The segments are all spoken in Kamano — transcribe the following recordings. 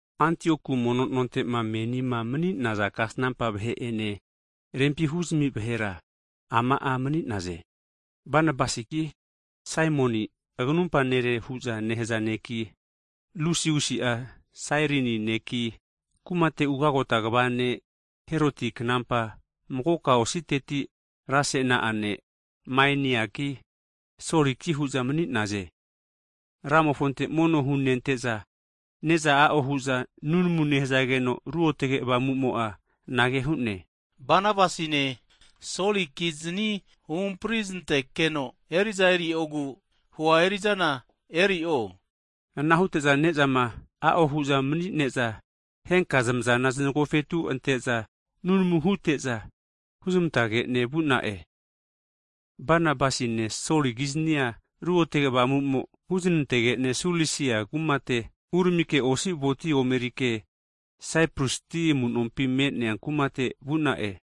Antiokua mono nontema menima mani'naza kasnampa vahe'ene, rempi huzmi vahera ama'a mani'naze, Banabasiki, Simioni (aganumpa nere hu'za nehaze ne'ki), Lusiusi'a Sairini ne'ki, kumate ugagota kva (Gavana) ne' Heroti knampa, magoka ositeti rasena'a ne' Maeniaki, Soliki hu'za mani'naze. Anamo'za Ramofonte mono hunente'za, ne'za a'o hu'za nunamu nehzageno, Ruotge Avamu'mo'a anage hu'ne, Banabasine Soli kizni huhampri znante'keno, eri'za eriogu hua eri'zana eri'o hu'ne. Ana hute'za ne'zama a'o hu'za mani'neza henka zamazana znagofetu ante'za nunamu hute'za huzamantake'ne vu'na'e. Banabasine Soli kiznia Ruotge Avamu'mo huznantege'ne Sulisia uramike osi voti omerike Saipras ti amunompi me'nea kumate vu'na'e.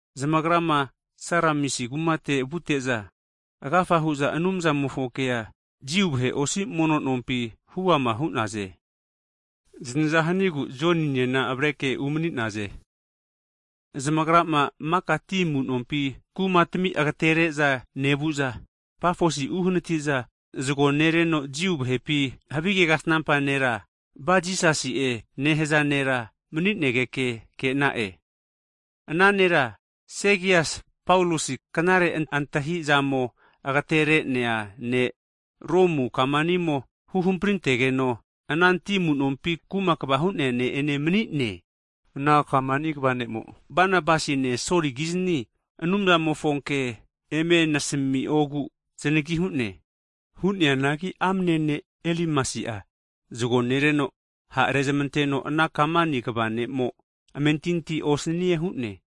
Zamagrama Saramisi kumate vute'za, agafa hu'za Anumzamofo kea Jiu vahe osi mono nompi (Sinagog) huama hu'naze. Zanaza hanigu Joninena avare'ke umani'naze. (Mago agi'a Jon Maki'e.) Zamagrama maka ti amunompi kumatami agatere'za nevu'za Pafosi uhanati'za zago nereno Jiu vahepi havige kasnampa nera, Bar Jisasi'e nehaza nera mani'negeke ke'na'e. Ana nera, Segias Paulosi knare antahizamo agatere'nea ne' Romu kamanimo huhamprintegeno ana ti amunompi kuma kava hu'nea ne' ene mani'ne, ana kamani kva (gavana) ne'mo Banabasine Soli kizni Anumzamofo ke eme asamiogu zanagi hu'ne. Hu'neanagi amene ne' Elimasi'a zago nereno ha' arezmanteno ana kamani kva ne'mo amentinti osanie hu'ne.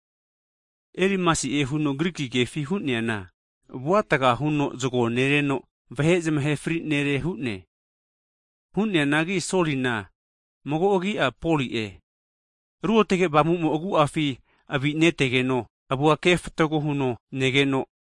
(Elimasi'e huno Griki kefi hu'neana, avuatga huno zago nereno vahe zamahe fri nere hu'ne.) Hu'neanagi Solina, mago agi'a Poli'e, Ruotge Avamumo'a agu'afi avinetegeno avua kefatago huno negeno,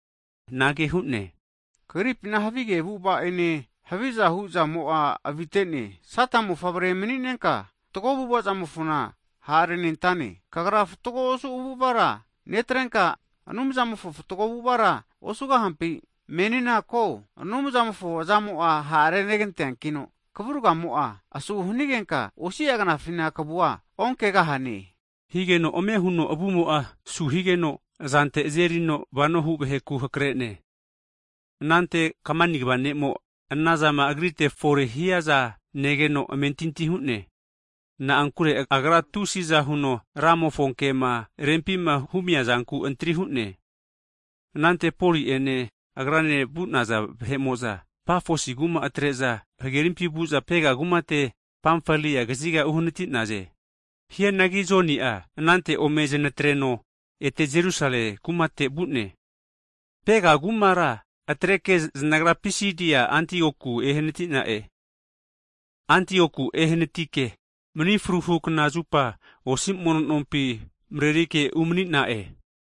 anage hu'ne, kagripina havige avu'avamo'ene havizahu zamo'a avite'ne, Sata mofavre mani'nenka, fatgo avu'avamofona ha' arenentane, kagra fatgo osu avu'avara netrenka, Anumzamofo fatgo avu'avara osugahampi? Menina ko, Anumzamofo azamo'a ha' reganteankino kavurgamo'a asu hanigenka, osi'a knafina kavua onkegahane! higeno ame huno avumo'a su higeno azante azerino vanohu vaheku hakre'ne. Anante kamani (Gavana) kva ne'mo anazama agrite fore hiaza negeno, amentinti hu'ne. Na'ankure agra tusi'za huno Ramofonkema rempima humia zankura antri hu'ne. Anante Poli'ene agrane vu'naza vahe'mo'za Pafosi kuma atre'za hagerimpi vu'za Pega kumate Pamfalia kaziga ehnati'naze. Hianangi Joni'a anante ome zanatreno ete Jerusale kumate vu'ne. Pega kumara atreke, zanagra Pisidi Antioku ehanatike, mni fruhu knazupa osi mono nompi (sinagog) marerike umani'na'e.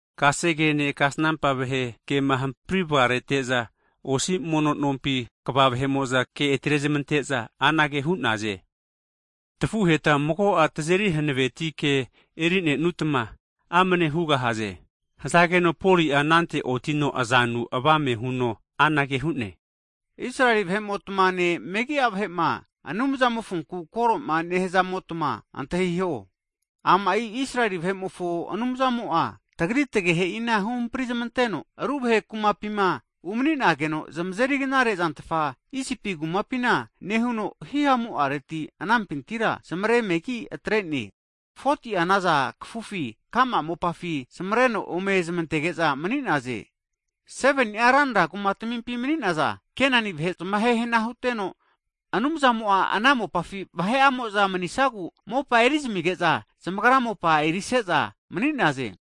Kasegene kasnampa vahe kema hampri vagarete'za osi mono nompi kva vahe'mo'za ke atrezmante'za anage hu'naze, tafuheta mago'a tazeri hanaveti ke eri'nenutma amane hugahaze. Hazageno Poli'a anante otino azanu avame huno anage hu'ne, Israel vahe'motmane megi'a vahe'ma Anumzamofonku koroma nehaza'motma antahiho. Ama'i Israeli vahe'mofo Anumzamo'a, tagri tagehe'ina huhampri zamanteno, ru vahe kumapima umani'nageno zamazeri knare zantfa Isipi kumapina nehuno hihamu'areti anampintira zamare megi atre'ne. 40ti'a naza kafufi ka'ma mopafi zamareno ome zamantege'za mani'naze. 7ni'a ranra kumatamimpi mani'naza Kenani vahe zamahe hana huteno, Anumzamo'a ana mopafi vahe'amo'za manisagu mopa erizamige'za zamagra mopa erise'za mani'naze.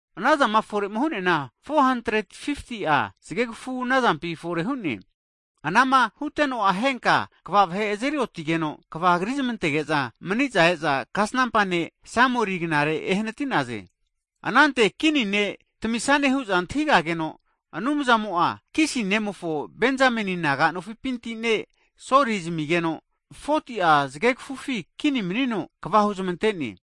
Anazama fore'ma hu'neana 450'a zgegfu nazampi fore hu'ne. Anama huteno'a henka kva vahe azeri otigeno kva krizmantege'za mani'za e'za kasnampa ne' Samueli'gnare ehnati'naze. Anante kini ne' tamisane hu'za antahigageno, Anumzamo'a Kisi nemofo Benzameni naga nofipinti ne' Soli zamigeno, 40ti'a zgegfufi kini manino kva huzmante'ne.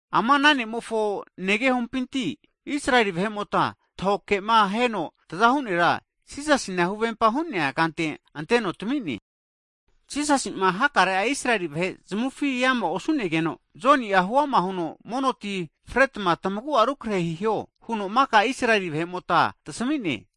Ama ana ne'mofo negehompinti, Israeli vahe'mota tahoke'ma heno tazahu nera Jisasina huvempa hu'nea kante anteno tami'ne. Jisasi'ma hakare'a Israeli vahe zamufi eama osu'negeno, Joni'a huama huno mono tina fretma tmagu'a rukrehe hiho huno maka Israeli vahe'mota tasami'ne.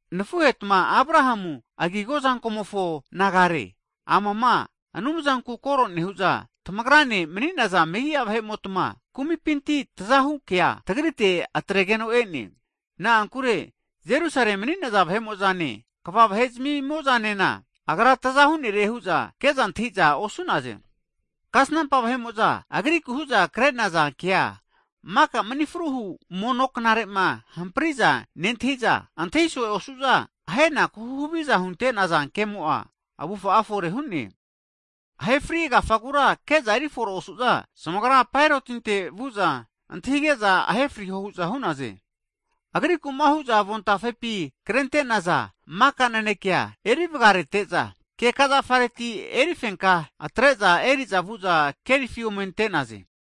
Nafuhetma Abrahamu agigo azankomofo nagare, amama Anumzanku koro nehu'za tamagrane mani'naza megi'a vahe'motma kumipinti tazahu kea tagrite atregeno e'ne. Na'ankure Jerusale mani'naza vahe'mo'zane, kva vahe'zmimo'zanena Agra taza hu'nere hu'za ke'za antahi'za osu'naze. Kasnampa vahe'mo'za Agriku hu'za kre'naza kea maka mni fruhu (sabat) mono knare'ma hampri'za nentahi'za, antahiso'e osu'za ahenaku huhaviza hunte'naza kemo'a, avufa'a fore hu'ne. Ahe fri agafagura ke'za erifore osu'za, zamagra Paerotinte vu'za, antahige'za ahe frio hu'za hu'naze. Agriku'ma hu'zama avon tafepi krente'naza maka nanekea huvgarete'za, keka zafareti erifenka atre'za eri'za vu'za kerifi ome ante'naze.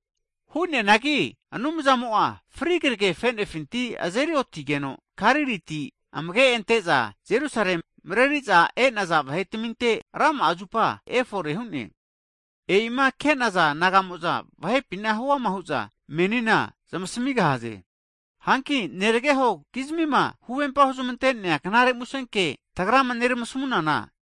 Hu'neanagi Anumzamo'a fri kragefe'nefinti azeri otigeno, Galiliti amage' ante'za Jerusalem mareri'za e'naza vahe'taminte rama'a zupa efore hu'ne. E'ima ke'naza nagamo'za vahepina huama hu'za menina zamasmi'gahaze. Hanki neragehokizmima huvempa huzmante'nea knare musenke tagrama neramasmunana,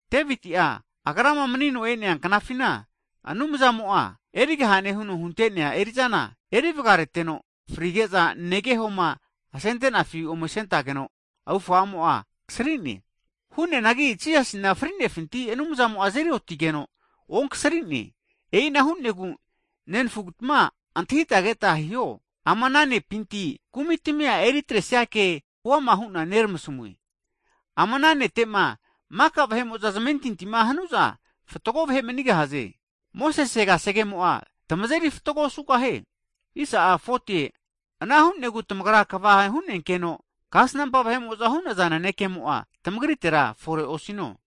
Deviti'a, agrama manino e'nea knafina Anumzamo'ma erigahane huno hunte'nea eri'zana eri vagareteno, frige'za negehoma asentenafi ome asentageno avufamo'a kasri'ne. Hu'neanagi Jisasina fri'nefinti Anumzamo azeri otigeno onkasri'ne. E'ina hu'negu nenafutma antahita keta hiho, ama ana ne'pinti kumi tamia eri atresia ke huama hu'na neramasmune. Ama ana nete'ma zamentinti hanu'za fatgo vahe manigahaze. Mosese kasegemo'a tamazeri fatgo osugahie. Ana hu'negu tamagra kava hu'nenkeno, kasnampa vahe'mo'za hu'naza nanekemo'a tmagritera fore osino.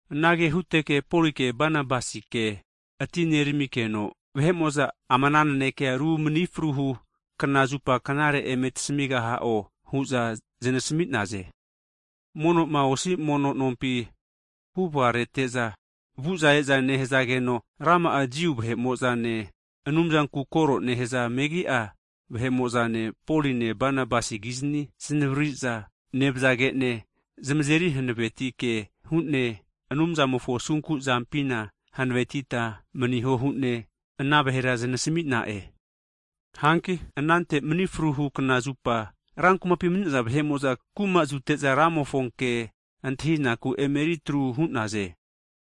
Anage huteke Poli'ene Banabasike atineramikeno, vahe'mo'za ama ana nanekea ru mni fruhu kna (sabat) zupa knare eme tasmigaha'o, hu'za zanasmi'naze. Mono'ma osi mono nompi (sinagog) huvgarete'za, vu'za e'za nehageno, rama'a Jiu vahe'mo'zane, Anumzanku koro nehaza megi'a vahe'mo'za, Poline Banabasi kizani zanavriri'za nevzage'ne, zamazeri hanaveti ke hu'ne, Anumzamofo asunku'zampina hanavetita maniho hu'ne ana vahera zamasmi'na'e. Hanki anante Mni fruhu kna (Sabat) zupa, ran kumapi mani'naza vahe'mo'za kuma azute'za Ramofo ke antahinaku emeritru hu'naze.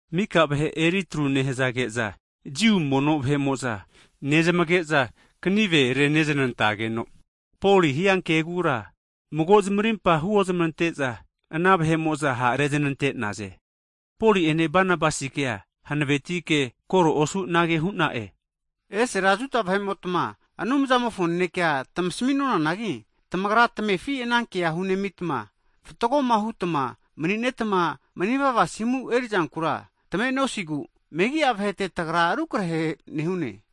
Mika vahe eritru nehzage'za Jiu mono vahe'mo'za nezmage'za kanive reneznantegeno Poli hiankegura mago zamarimpa huoznante'za, ana vahe'mo'za ha' reznante'naze. Poli'ene Banabasi'kea hanavetike koro osu anage hu'na'e, Esera Juda vahe'motma Anumzamofo nanekea tmasmi'nonanagi, tamagra tmefi ana kea hunemitma fatgoma hutma mani'netma manivava asimu erizankura tame'nosigu, megi'a vahete tagra rukarehe nehu'e.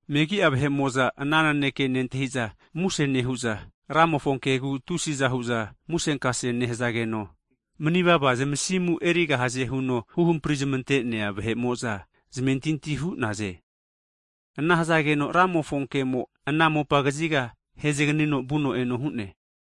Megi'a vahe'mo'za ana naneke nentahiza muse nehu'za, Ramofo kegu tusi'za hu'za musenkase nehazageno, mani'vava zamasimu erigahaze huno huhampri zamante'nea vahe'mo'za zamentinti hu'naze. Ana hazageno Ramofo kemo ana mopa kaziga haezganino vuno eno hu'ne.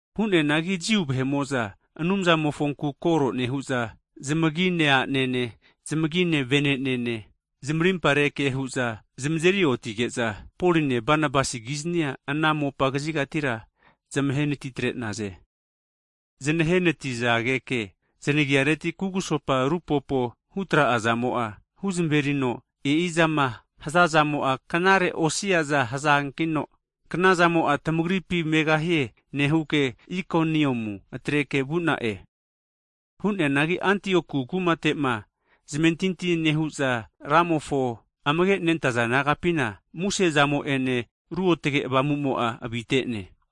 Hu'neanagi Jiu vahe'mo'za, Anumzamofonku koro nehu'za zamagi me'nea a'nene, zamagi me'nea vene'nene zamarimpare ke hu'za zamazeri otige'za, Poline Banabasi kiznia, ana mopa kazigatira zamahe anati tre'naze. Zanahe anatizageke, zanagiareti kugusopa rupopo hutra'azamo'a, huzmerino e'izama hazazamo'a knare osiaza hazankino knazamo'a tmagripi megahie nehuke, Ikoniamu atreke vu'na'e. Hu'neanagi Antioku kumate'ma zamentinti nehu'za Ramofo amage nentaza nagapina muse'zamo'ene Ruotge Avamu'mo'a avite'ne.